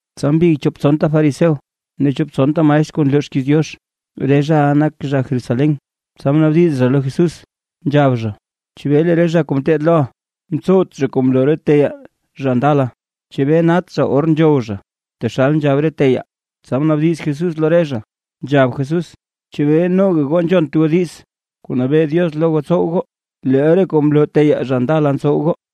Tsa mbig chop tsonta fariseo ne chop tsonta maestr kuu nloo xkiiz Diox, re zhaʼa nak zha Jerusalén, tsa mnaabdiz zha lo Jesús, nzhab zha: ―¿Chebee lee re zha kuu ngeteed loʼa ntsowt zha kuu mloo re teyaa zha ndala? ¿Chebee nat zha or nzhow zha, taxal nzhab re teyaa? Tsa mnaabdiz Jesús lo re zha, nzhab Jesús: ―¿Chebee noga goo nzhont goo diiz kuu nabee Diox lo goo tsow goo, leel re kuu mloo teyaa zha ndala ntsow goo?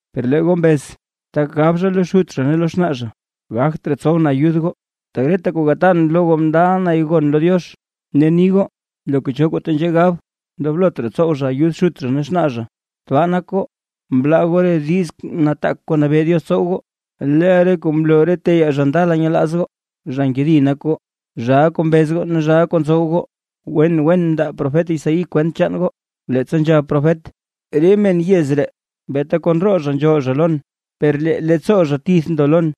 Per lee goo mbez tak gab zha lo xut zha ne lo xnaa zha: “Gagt raa tsowʼn ayud goo, tak reta kuu gatan lo goo mndaʼa nay gon lo Diox”. Ne ni goo loka cho kuu tenzhee gab, ndoblot raa tsow zha ayud xut zha ne xnaa zha. Tbaa nak goo, mlaa goo re diiz nataak kuu nabee Diox tsow goo, leel re kuu mloo re teyaa zha ndala nyelaaz goo. ¡Zha nkedi nak goo, zhaa kuu mbez ne zhaa kuu ntsow goo! Wen wen mndaa profet Isaí kwent chaan goo, leettsa nzhab profet: Re men yez ree beeta kon roo zha nzhool zha lon, per lee leettsoo zha tith ndo lon.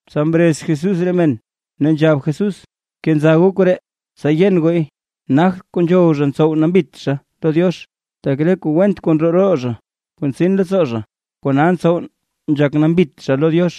Tsa mrez Jesús re men, ne nzhab Jesús: ―Bkenza goo koree, tsa yen gooy. Nagt kuu nzhow zha ntsow nambit zha lo Diox, tak re kuu went kuu ndroo roo zha kuu ntsin leettsoo zha, kona ntsow nzhak nambit zha lo Diox.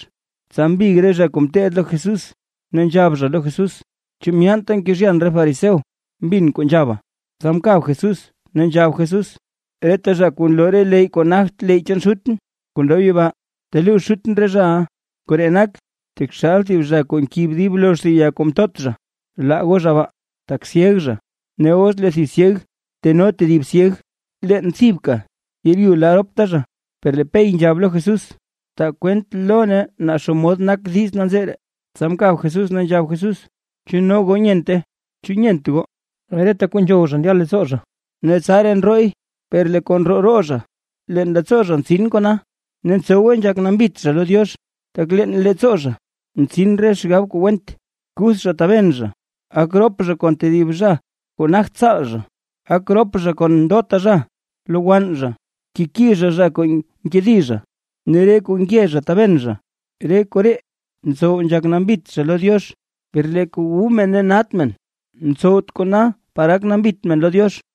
Tsa mbig re zha kuu ngeteed lo Jesús, ne nzhab zha lo Jesús: ―¿Chu myeenta mkezhyan re fariseo mbin kuu nzhaba? Tsa mkab Jesús, ne nzhab Jesús: ―Reta zha kuu nloo re leyy kuu nagt leyy chaan Xutʼn kuu ndob yibaa, teluux Xutʼn re zhaʼa, koree nak taxal zha kuu nkib dib lozh thib ya kuu mtot zha. Laa goo zha baa, tak syeg zha. Ne os lee thib syeg teno tedib syeg, leen thibka yeeryu la ropta zha. Per lee Pey nzhab lo Jesús: ―Taa kwent lo nee naa xomod nak diiz nanzee ree. Tsa mkab Jesús ne nzhab Jesús: ―¿Chu no goo nyente? ¿Chu nyent goo, reta kuu nzhow zha ndya leettsoo zha, ne tsaraa ndrooy? Per lee kuu ndroo roo zha, leen leettsoo zha ntsin kona, ne ntsowe nzhak nambit zha lo Diox. Tak leen leettsoo zha: ntsin re xgab kuu went, kuth zha taben zha, gak rop zha kon thib zha kuu nagt tsaal zha, gak rop zha kon ndota zha, lowann zha, nkeki zha re zha kuu nkedi zha, ne re kuu nge zha taben zha. Re koree ntsow nzhak nambit zha lo Diox; per lee kuu wu men ne nat men, ntsowt kona par gak nambit men lo Diox.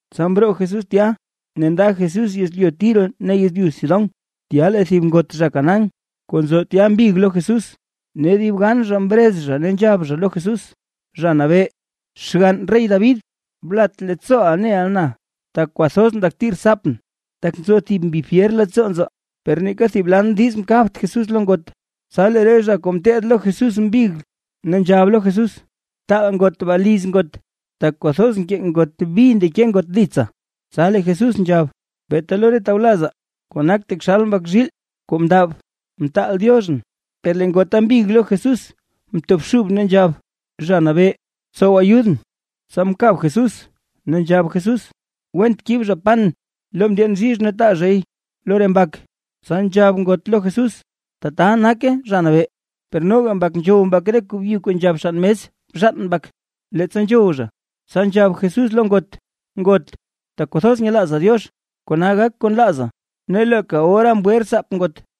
Tsa mroo Jesús tya ne nda Jesús yezlyu Tiro ne yezlyu Sidón. Tya lee thib ngot zha Canaán, kuu nzo tya mbig lo Jesús, ne dib gan zha mrez zha ne nzhab zha lo Jesús: ―¡Zha Nabee, xgann rey David, blat leettsooʼa neʼa na! Tak kwathoz ndakti rtsaapʼn, tak nzo thib mbi fyer leettsoo nzaa. Per neeka thib lan diiz mkabt Jesús lo ngot. Tsa lee re zha kuu ngeteed lo Jesús mbig, ne nzhab lo Jesús: ―Btaal ngot baa liz ngot, tak kwathoz nkee ngot bi ndeke ngot ditsaa. Tsa lee Jesús nzhab: ―Beeta lo re tawlazaa kuu nak taxal mbak zhiil kuu mndab, mtaal Dioxʼn. Per lee ngota mbig lo Jesús mtobxub ne nzhab: ―Zha Nabee, btsow ayudʼn. Tsa mkab Jesús, ne nzhab Jesús: ―Went kib zha pan lo ndyeen bzhizh ne taa zhay lo re mbak. Tsa nzhab ngot lo Jesús: ―Tata nake, Zha Nabee. Per noga mbak nzhow mbak re kuu byu kuu nzhab xann mes bzhaan mbak, leettsa nzhow zha. Tsa nzhab Jesús lo ngot: ―¡Ngot, tak kwathoz nyelaaza Diox! Kona gak kuu nlaaza. Ne leeka ora mgwe rtsaap ngot.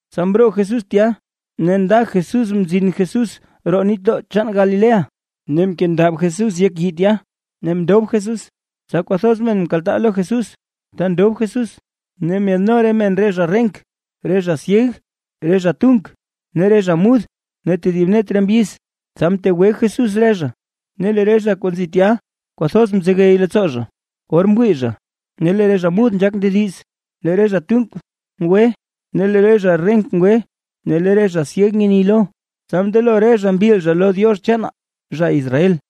Tsa mroo Jesús tya ne nda Jesús mzin Jesús roo nitdoo chaan Galilea, ne mkendab Jesús yek yii tya ne mndob Jesús. Tsa kwathoz men mkaltaa lo Jesús ta ndob Jesús. Ne myaadno re men re zha renk, re zha syeg, re zha tunk, ne re zha mud ne tedib net re mbyiz. Tsa mtegwe Jesús re zha. Ne lee re zha kuu nzi tya kwathoz mzegey leettsoo zha, or mwii zha, lee re zha mud nzhaak ndediz, lee re zha tunk ngwe, ne lee re zha renk ngwe ne lee re zha syeg nyeni lo. Tsa mndelo re zha mbil zha lo Diox chaanaa, zha Israel.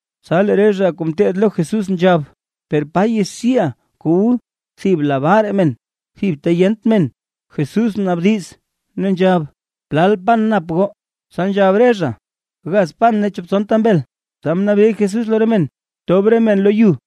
Tsa lee re zha kuu ngeteed lo Jesús nzhab: ―¿Per pa yaxiiʼaa kuu wu thib labaa raa men, thib ta yent men? Jesús mnaabdiz, ne nzhab: ―¿Plal pan nap goo? Tsa nzhab re zha: ―Gaz pan ne chop tsonta mbel. Tsa mnabee Jesús lo re men tob re men lo yu.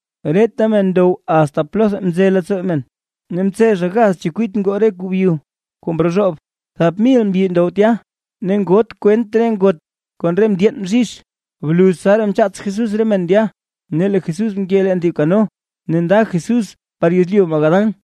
Reta men ndow asta plotha mze leettsoo men. Ne mtse zha gaz chekwit ngoo re kuu byu kuu mrozhoob. Thap mil mbyi ndow tya, ne ngoot kwent re ngot kon re ndyeen bzhizh. Bluz tsaraa mchaats Jesús re men ndya, ne lee Jesús mke leen thib kano ne nda Jesús par yezlyu Magadán.